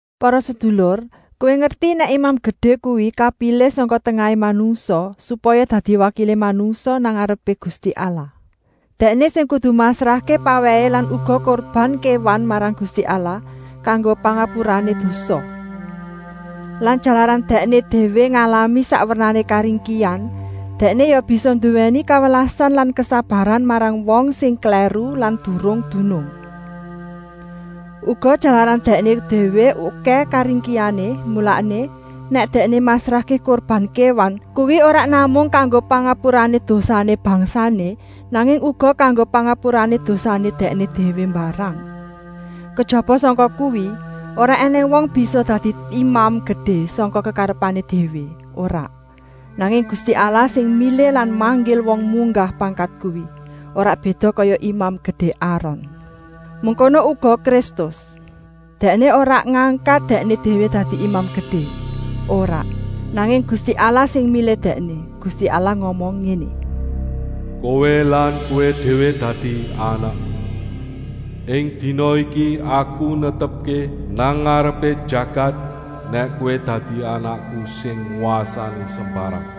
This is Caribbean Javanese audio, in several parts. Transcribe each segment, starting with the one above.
Para sedulur, kowé ngerti nèk Imam Gedé kuwi kapilih sangka tengahé manungsa, supaya dadi wakilé manungsa nang ngarepé Gusti Allah. Dèkné sing kudu masrahké pawèhé lan uga kurban kéwan marang Gusti Allah, kanggo pangapurané dosa. Lan jalaran dèkné déwé ngalami sak wernané karingkihan, dèkné ya bisa nduwèni kawelasan lan kesabaran marang wong sing klèru lan durung dunung. Uga, jalaran dèkné déwé okèh karingkihané, mulané, nèk dèkné masrahké kurban kéwan, kuwi ora namung kanggo pangapurané dosané bangsané, nanging uga kanggo pangapurané dosané dèkné déwé mbarang. Kejaba sangka kuwi, ora ènèng wong bisa dadi Imam Gedé sangka kekarepané déwé, ora, nanging Gusti Allah sing milih lan manggil wong munggah pangkat kuwi, ora béda kaya Imam Gedé Aron. Mengkono uga Kristus, Dèkné ora ngangkat Dèkné déwé dadi Imam Gedé, ora, nanging Gusti Allah sing milih Dèkné. Gusti Allah ngomong ngéné: “Kowé lan Kowé déwé dadi Anakku. Ing dina iki Aku netepké nang ngarepé jagat nèk Kowé dadi Anakku sing ngwasani sembarang.”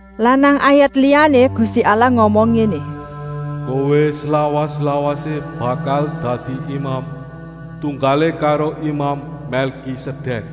Lan nang ayat liyané Gusti Allah ngomong ngéné: “Kowé slawas-lawasé bakal dadi Imam, tunggalé karo Imam Mèlkisedèk.”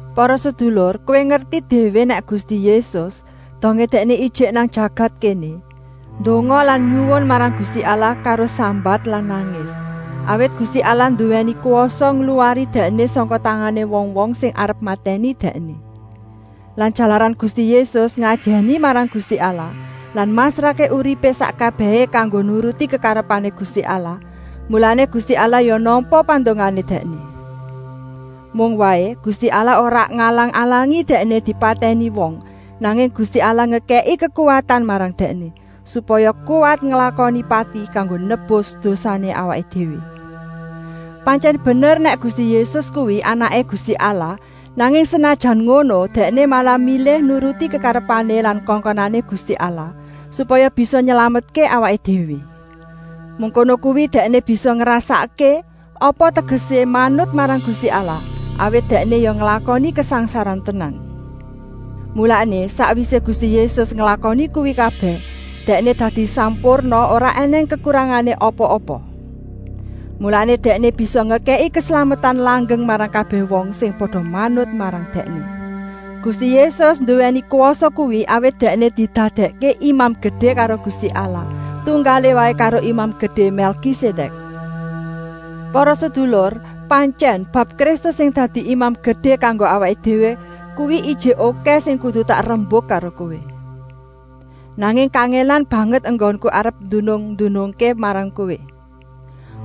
Para sedulur, kowé ngerti déwé nèk Gusti Yésus, dongé Dèkné ijik nang jagat kéné, ndonga lan nyuwun marang Gusti Allah karo sambat lan nangis, awit Gusti Allah nduwèni kwasa ngluwari Dèkné sangka tangané wong-wong sing arep matèni Dèkné. Lan jalaran Gusti Yésus ngajèni marang Gusti Allah lan masrahké uripé sak kabèhé kanggo nuruti kekarepané Gusti Allah, mulané Gusti Allah ya nampa pandongané Dèkné. Mung waé, Gusti Allah ora ngalang-alangi Dèkné dipatèni wong, nanging Gusti Allah ngekèki kekuwatan marang Dèkné, supaya kuwat nglakoni pati kanggo nebus dosané awaké déwé. Pantyèn bener nèk Gusti Yésus kuwi Anaké Gusti Allah, nanging senajan ngono, Dèkné malah milih nuruti kekarepané lan kongkonané Gusti Allah, supaya bisa nylametké awaké déwé. Mengkono kuwi Dèkné bisa ngrasakké apa tegesé manut marang Gusti Allah, awit Dèkné ya nglakoni kasangsaran tenan. Mulané, sakwisé Gusti Yésus nglakoni kuwi kabèh, Dèkné dadi sampurna, ora ènèng kekurangané apa-apa. Mulané Dèkné bisa ngekèki keslametan langgeng marang kabèh wong sing pada manut marang Dèkné. Gusti Yésus nduwèni kwasa kuwi, awit Dèkné didadèkké Imam Gedé karo Gusti Allah, tunggalé waé karo Imam Gedé Mèlkisedèk. Para sedulur, pantyèn, bab Kristus sing dadi Imam Gedé kanggo awaké déwé kuwi ijik okèh sing kudu tak rembuk karo kowé. Nanging kangèlan banget enggonku arep ndunung-ndunungké marang kowé.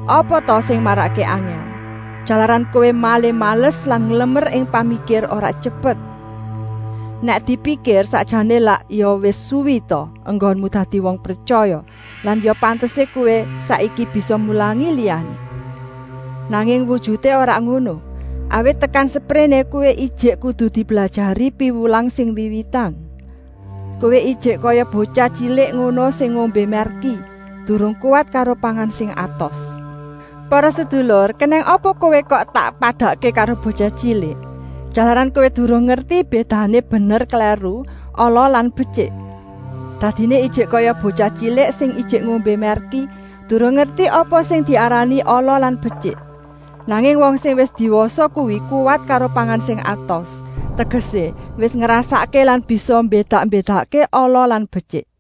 Apa ta sing marakké angèl? Jalaran kowé malih males lan nglemer ing pamikir, ora tyepet. Nèk dipikir, sakjané lak ya wis suwi ta enggonmu dadi wong pretyaya lan ya pantesé kowé saiki bisa mulangi liyané. Nanging wujuté ora ngono, awit tekan sepréné kowé ijik kudu diblajari piwulang sing wiwitan. Kowé ijik kaya botyah tyilik ngono, sing ngombé mèrki, durung kuwat karo pangan sing atos. Para sedulur, kenèng apa kowé kok tak padakké karo botyah tyilik? Jalaran kowé durung ngerti bédané bener-klèru, ala lan betyik. Dadiné ijik kaya botyah tyilik sing ijik ngombé mèrki, durung ngerti apa sing diarani ala lan betyik. Nanging wong sing wis diwasa kuwi kuwat karo pangan sing atos, tegesé, wis ngrasakké lan bisa mbédak-mbédakké ala lan betyik.